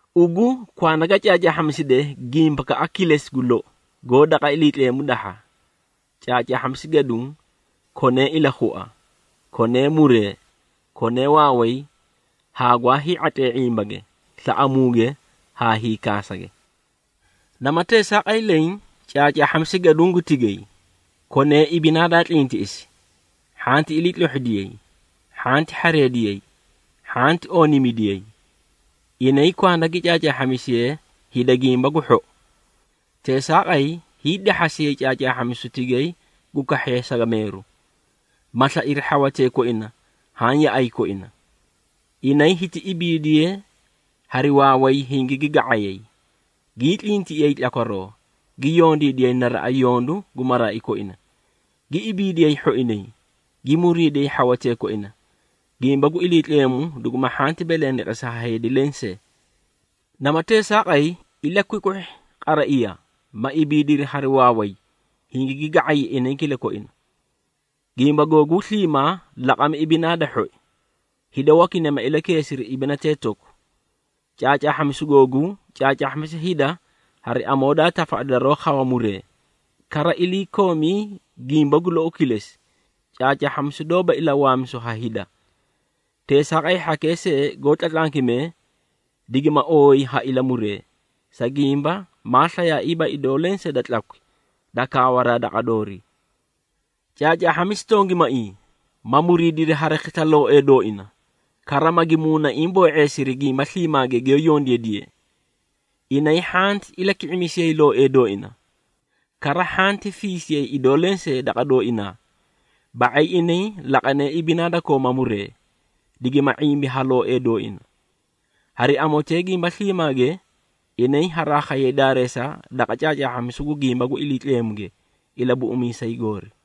Ugu kwanda ga caacaahhamiside gimbakaꞌa kilesi gu lou, goó daqa Iliitleemu dahha. Caacaahhamisi gaduũ, konee ilakhua, konee muree, konee waaway haa gwaa hii⁄atlee ⁄imbage, slaꞌamuuge haa hiikaasage. Nama teesaaqay leẽ, caacaahhamisi gaduũ gu tigay, konee ibinaa daa tlintiꞌisi, hhanti iliitlohhidiyay, hhanti hhareediyay, hhanti ooniimidiyay. Inay kwanda gi caacaahhamisiyee hida gimba gu hhou. Teesaaqay hiidahhasiyay caacaahhamisu tigay gu kahhee sagameeru, ma slairi hhawatee koina haã yaꞌay koina. Inay hiti ibiidiyee hari waaway hingigi ga⁄ayay, gii tlintiꞌiyay tlakwaroo, gi yondiidiyay naraꞌa yondu gu maraai koina, gi ibiidiyay hhoinay, gi muriidiyay hhawatee koina, gimba gu Iliitleemu dugu hhanti belendeqesi ha heedi lensee. Nama teesaaqay, ilakwikwihhi qaraiya, ma ibiidiri hari waaway hingigi ga⁄ay inay kilakoina. Gimba googuu sliimaa, laqami ibinaa da hhoi, hida wakinay ma ilakeesiri ibinatee toku. Caacaahhamisuu googuu, caacaahhamisi hida hari amoo daa tafaꞌadi daroó khawa muree. Kara iliikoomii gimba gu lou kilesi, caacaahhamisu doóba ilawaamisu ha hida. Teesaaqay hhakee seei goó tlatlankimee, digimaa ooyi ha ilamuree, sa gimba maa slayaaiiba idoo lenseei da tlakwi da kaawaraa daqa doorii. Caacaahhamisi tongimaiĩ, ma muriidiri hari khisla looee dooina, kara magi muunaiĩ boo⁄eesiri gimba sliimaage giyoó yondiidiyee. Inay hhanti ilaki⁄imisiyay looee dooina, kara hhanti fiisiyay idoo lenseei daqa dooinaa, ba⁄ay inay laqanee ibinaa da kooma muree, digima ⁄imbi ha looee dooina. Hari amotee gimba sliimaage, inay haraa khayay daareesa daqa caacaahhamisu gu gimba gu Iliitleemuge Ilabuꞌumiisay goori.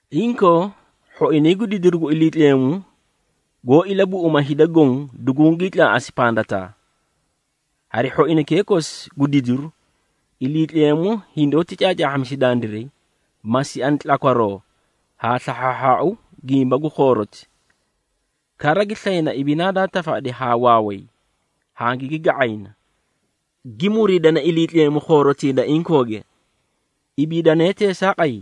Inkoo, hhoinay gu didiru gu Iliitleemu goó ilabuꞌuma hida goõ dugungii tlaaꞌasi pandataa. Hari hhoinaykee kosi gu didiru, Iliitleemu hindoóti caacaahhamisi dandiray, ma siani tlakwaroo haa slahhaahhaau gimba gu khooroti, kara gi slayna ibinaa daa tafaꞌadi haa waaway hangigi ga⁄ayna, gi muriidana Iliitleemu khoorotii da inkooge. Ibiidane teesaaqay,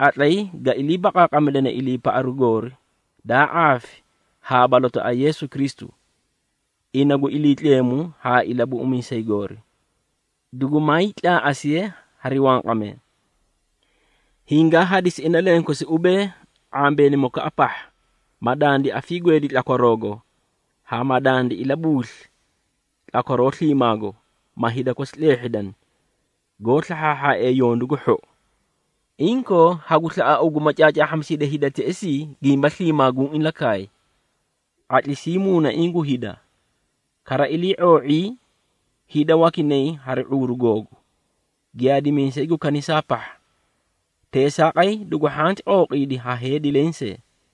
qatlay ga ilii baqaaqamidane iliipaꞌaru goori daa ⁄aafi haa balotaꞌa Yeesu Kristu, ina gu Iliitleemu haa Ilabuꞌumiisay goori, dugumaay tlaaꞌasiye hari wanqamee. Hingaa hadisi ina lenkosi ubee, ⁄ambeenimokaꞌa pahha, ma dandi afiigweedi tlakwaroogo haa ma dandi ilabuusli tlakwaroo sliimaago, ma hida kosi tleehhidani, goó slahhaahhaaee yondu gu hhou. Inkoo hagu slaꞌa, ugu ma caacaahhamisidi hida teꞌesii gimba sliimaa guũ ilakaay, ⁄atlisii muunaiĩ gu hida, kara ilii⁄oo⁄ii hida wakinay hari ⁄uuru googu, giyaadimiisay gu kanisaa pahha. Teesaaqay dugu hhanti qooqiidi ha heedi lenseei.